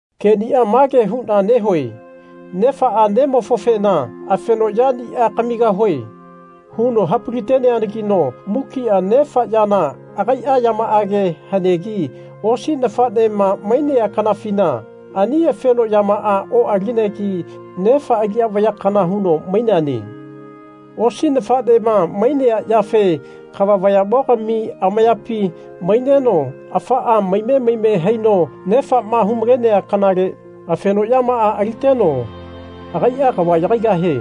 Kenia mage huna nehue nefaa nemofofena Afeno yania kamigahue. huno hapali-teneanagino mukia nefa yana agaia yamaage hanegi osi nafanema mainea kanafina ani afeno yamaa oalinegi nefa aliya vaya kana huno maineane. Osi nafanema mainea yafe kava vayamogami amayapi maineno afaa maime maime haino nefama humalenea kanale afeno yamaa aliteno agaia kava yagaigahie.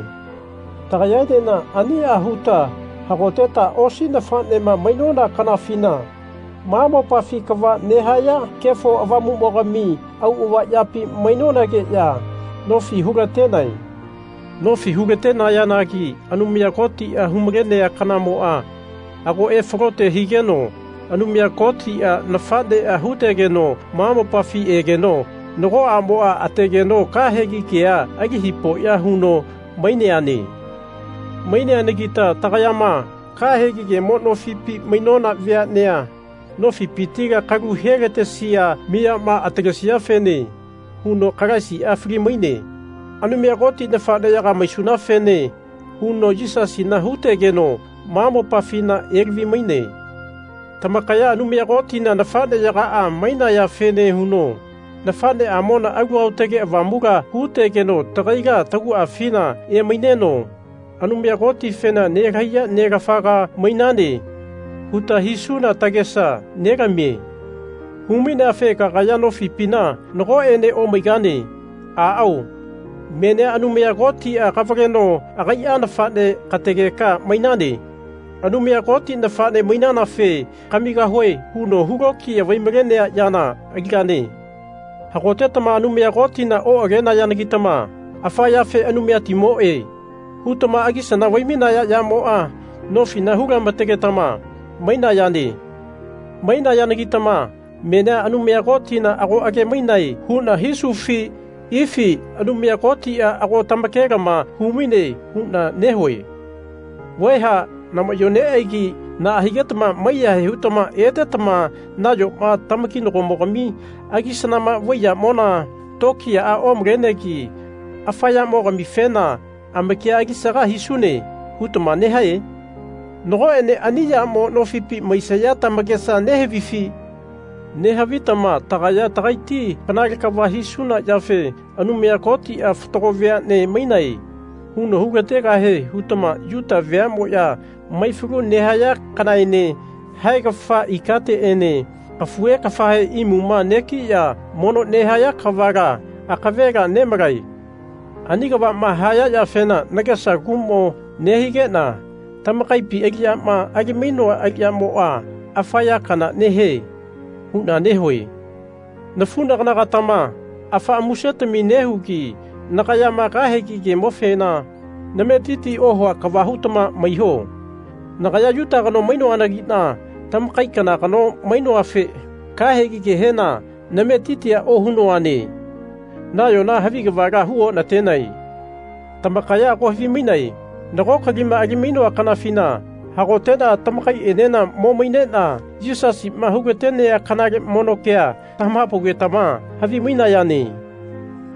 Tagayaenena ania huta hagoteta osi nafanema mainona kanafina ma mopafi kava nehaya Kefo Avamumogami auava yapi mainonageya nofi hulatenae. Nofi hu-latenayanagi Anumaya Kotia humalenea kanamoa ago efalote higeno Anumaya Kotia nafanea hutegeno ma mopafi egeno nago amoa ategeno kahegi kea ali hipoya huno maineane. Maineanagita tagayama, kahegi kemo nofipi mainona veanea nofipitila kalu helatesia miyama atalesiafene huno Kalaisia fali-maine. Anumaya Koti nafaneyaga maisunafene huno Yisasina hutegeno ma mopafina elavi-maine. Tamakaya Anumaya Kotina nafaneyagaa mainayafene huno nafaneamona Alu Aotage Avamula hutegeno tagaila taguafina emaineno Anumaya Kotifena Nelahaiya Nelafaga mainane. huta hisuna tagesa nelamie. Humaineafe kagaya nofipina nagoene omaigane. Aao. Menia Anumaya Kotia kavaleno agaia nafane kategeka mainane. Anumaya Koti nafane mainanafe Kamigahue. huno hulokiya vaimalenea yana aligane. Hagotetama Anumaya Kotina oagenayanagitama afa yafe Anumayatimoe. hutama agisana vaimainaya yamoa nofi hu-lamategetama mainayane. Mainayanagitama menia Anumaya Kotina ago age-mainae huna hisufi ifi Anumaya Kotia ago tamakelama humaine huna nehue. Vaeha namayo neaigi naa higetama maiyahae hutama etetama nayoma tamakinagomogami agisanama vai yamona tokiyaa omalenegi afa yamogamifena Amakia alisaga hisune. hutama nehae? Nagoene ani yamo nofipi maisaya tamakesa nehavifi? Nehavitama Tagaya tagaiti kanale kava hisuna yafe Anumaya Kotia Fatago veane mainae. huno hulategahie hutama Yuta veamoya maifalu nehaya kanaene haegafa ikateene kafuhe kafahe imuma negiya mono nehaya kavala akavela nemalae. Ani kavama haya yafena nagesa kumo nehigena tamakaipi aliyama ali-mainoa aliyamoa afa ya kana nehie. huna nehue. Nafunagana-gatama afaa musetami nehugi nagayama kahegi kemofena nametiti ohua kava hutama maiho. Nagaya Yuta kano mainoanagina tamakai kana kano mainoafe kahegi kehena nametitia ohunoane nayona havi kavala hu onatenae. Tamakaya ago havimainae nago kalima alimainoa kanafina hagotena tamakaienena mo mainena Yisasima hulatenea kanale mono kea tamahapaugetama havi-mainayane.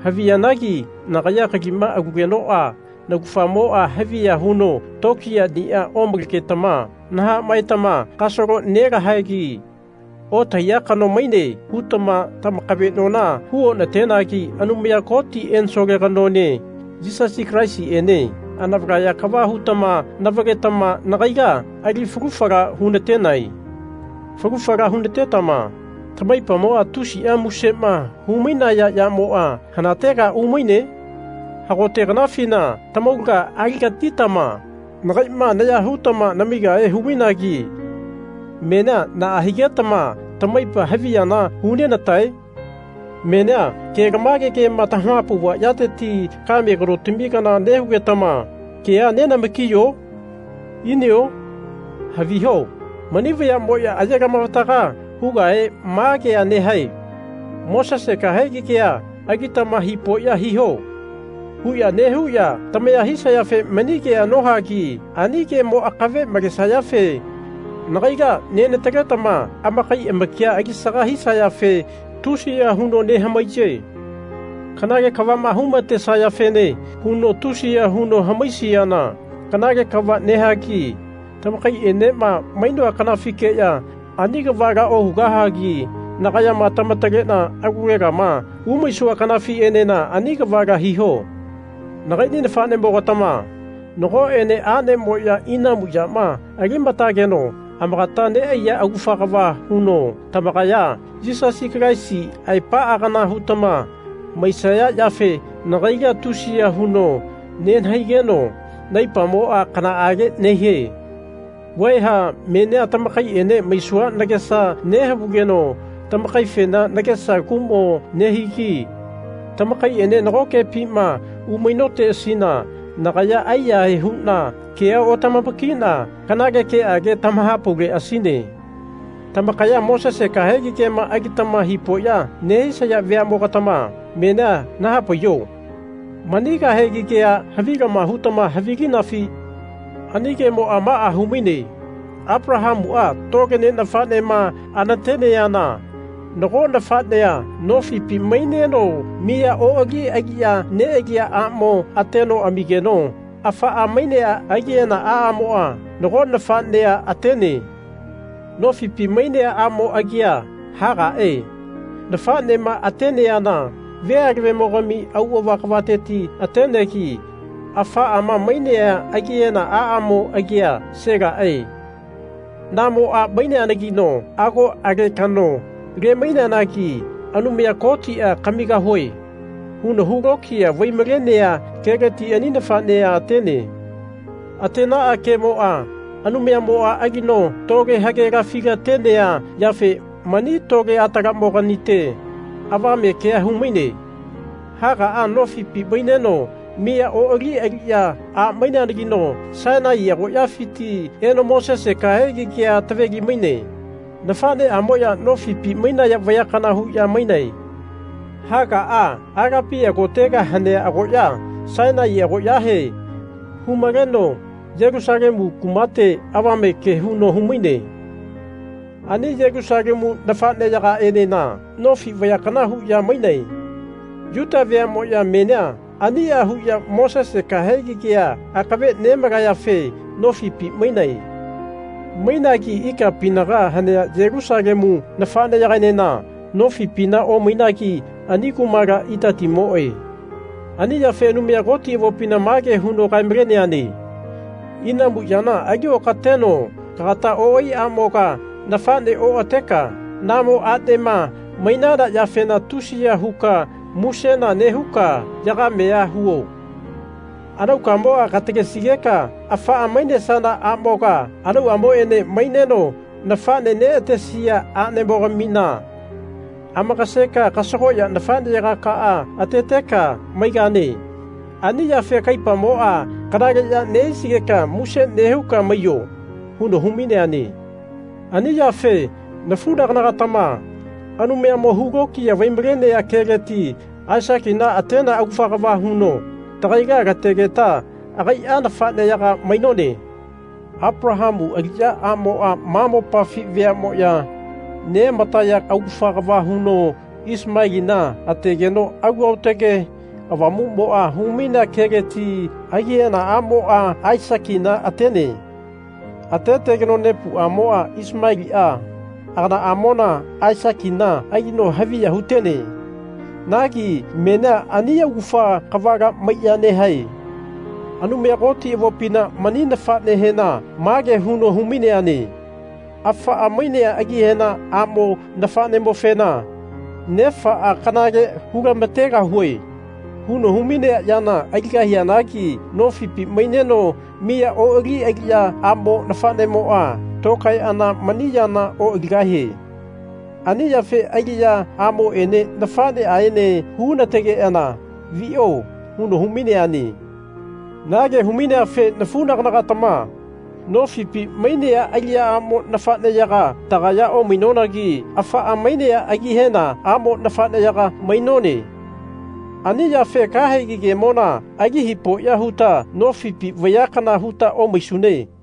Haviyanagi nagaya kalima alugenoa naugafamoa haviya huno tokiyania omalegetama nahamaetama Kasalo nelahaegi. Otahaiya kano maine. hutama tamakavenona hu onatenagi Anumaya Koti ensole kanoene Yisasi Kalaisiene anavalaya kava hutama navaletama nagaila ali falu fala hunatenae. Falu fala hunatetama tamaipamoa tusia musema humainaya yamoa hanatega umaine? Hagote kanafina tamaulaga alilagatitama nagaima naya hutama namigahe humainagi menia naa higetama tamaipa haviyana hunenatae? Menia kelamage kema tamahapauva yateti kame kanotami kana nehugetama keanenamakiyo? Inio? Haviho mani vayamoya ayelamavataga hugahe ma kea nehae Mosese kahegi kea alitama hipoya hiho. huya nehuya tamaya hisayafe mani kea nohagi ani kemo akave malesayafe nagaila nenataletama amakai amakia alisaga hisayafe tusiya huno nehamaiye. Kanale kavama humatesayafene huya tusiya huno hamaisiana kanale kava nehagi tamakaienema mainoa kanafikeya ani kavala ohugahagi nagayama tamatalena alulegama umaisua kanafienena ani kavala hiho. Nakaini nafanemogatama nagoene anemoya inamu yama alimategeno amakata neaiya augafa kava huno tamakaya Yisasi Kalaisi aepaa kana hutama maisaya yafe nagaila tusiya huno nenahaigeno naipamoa kanaage nehie. Vaeha menia tamakaiene maisua nagesa nehavugeno tamakaifena nagesa kumo nehigi. Tamakaiene nagokepima umainoteasina nagaya aiyahae huna kea otamamakina kanale keage tamahapauleasine. Tamakaya Mosese kahegi kema alitama hipoya nehisaya veamogatama menia nahapaiho. Mani kahegi kea havilama hutama havilinafi? Ani kemoa maa humaine. Apalahamua tole ne nafanema anateneana nago nafanea nofipi maineno miya oali aliya nealia amo ateno amigeno afaa mainea agihena aamoa nago nafanea atene. Nofipi mainea amo agia Hagae nafanema ateana ve alavemogami auava kavateti atenegi afaama mainea agihena aamo agia Selae namo a maineanagino ago alekano le-maineanagi Anumaya Kotia Kamigahue. huno hulokiya vaimalenea keleti ani nafanea atene. Atenaa kemoa Anumayamoa alino tole hagelafi-latenea yafe mani tole atalamoganite avame kea humaine. Hagaa nofipi maineno miya oali aliya a maineanagino Sainai agoyafiti eno Mosese kahegi kea taveli-maine. Nafaneamoya nofipi mainaya vaya kana huya mainae. Hagaa Alepia kotega hanea agoya, Sainai agoyahe humaleno Yelusalemu kumate avame ke huno humaine. Ani Yelusalemu nafaneyagaenena nofi vaya kana huya mainae. Yuta veamoya menia ania huya Mosese kahegi kea akave nemalayafe nofipi mainae. Mainagi ikapinaga hanea Yelusalemu nafaneyagaenena nofipina omainagi ani kumala itatimoe. Ani yafe Anumaya Koti avopina mage huno kae-maleneane Inamu yana ali okateno kagata oai amoga nafane oateka, namo anema mainana yafena tusiya huka musena nehuka yagamea huo. Anaukamoa katalesigeka afaa mainesana amoga anauamoene maineno nafane neatesia anemogamina amakaseka kasagoya nafaneyakaa ateteka maigane. Ani yafe kaipamoa kanaleya nehisigeka muse nehuka maiyo. huno humaineane. Ani yafe, nafunagana-gatama, Anumayamo hulokiya vaimalenea keleti Aisakina atenea augafa kava huno tagaila lategeta agaia nafaneyaga mainone. Apalahamu aliya amoa ma mopafi veamoya neamataya augafa kava huno Isimelina ategeno Alu Aotage Avamumo humainea keleti agihena amoa Aisakina atene. Atetegeno nepuamoa Isimelia aganaamona Aisakina alino haviya hutene. Nagi menia ani augafa kavala maiya nehae. Anumaya Koti avopina mani nafanehena mage huno humaineane Afaa mainea agihena amo nafanemofena nefaa Kanale hulamategahue. huno humainea yana aligahianagi nofipi maineno miya oali aliya amo nafanemoa tokaeana mani yana oaligahie. Ani yafe aliya amoene nafaneaene hunategeana vio. huno humaineane. Na ke humaineafe nafunagana-gatama nofipi mainea aliya amo nafaneyaga tagaya omainonagi afaa mainea agihena amo nafaneyaga mainone. Ani yafe kahegi kemona ali hipoya huta nofipi vaya kana huta omaisune.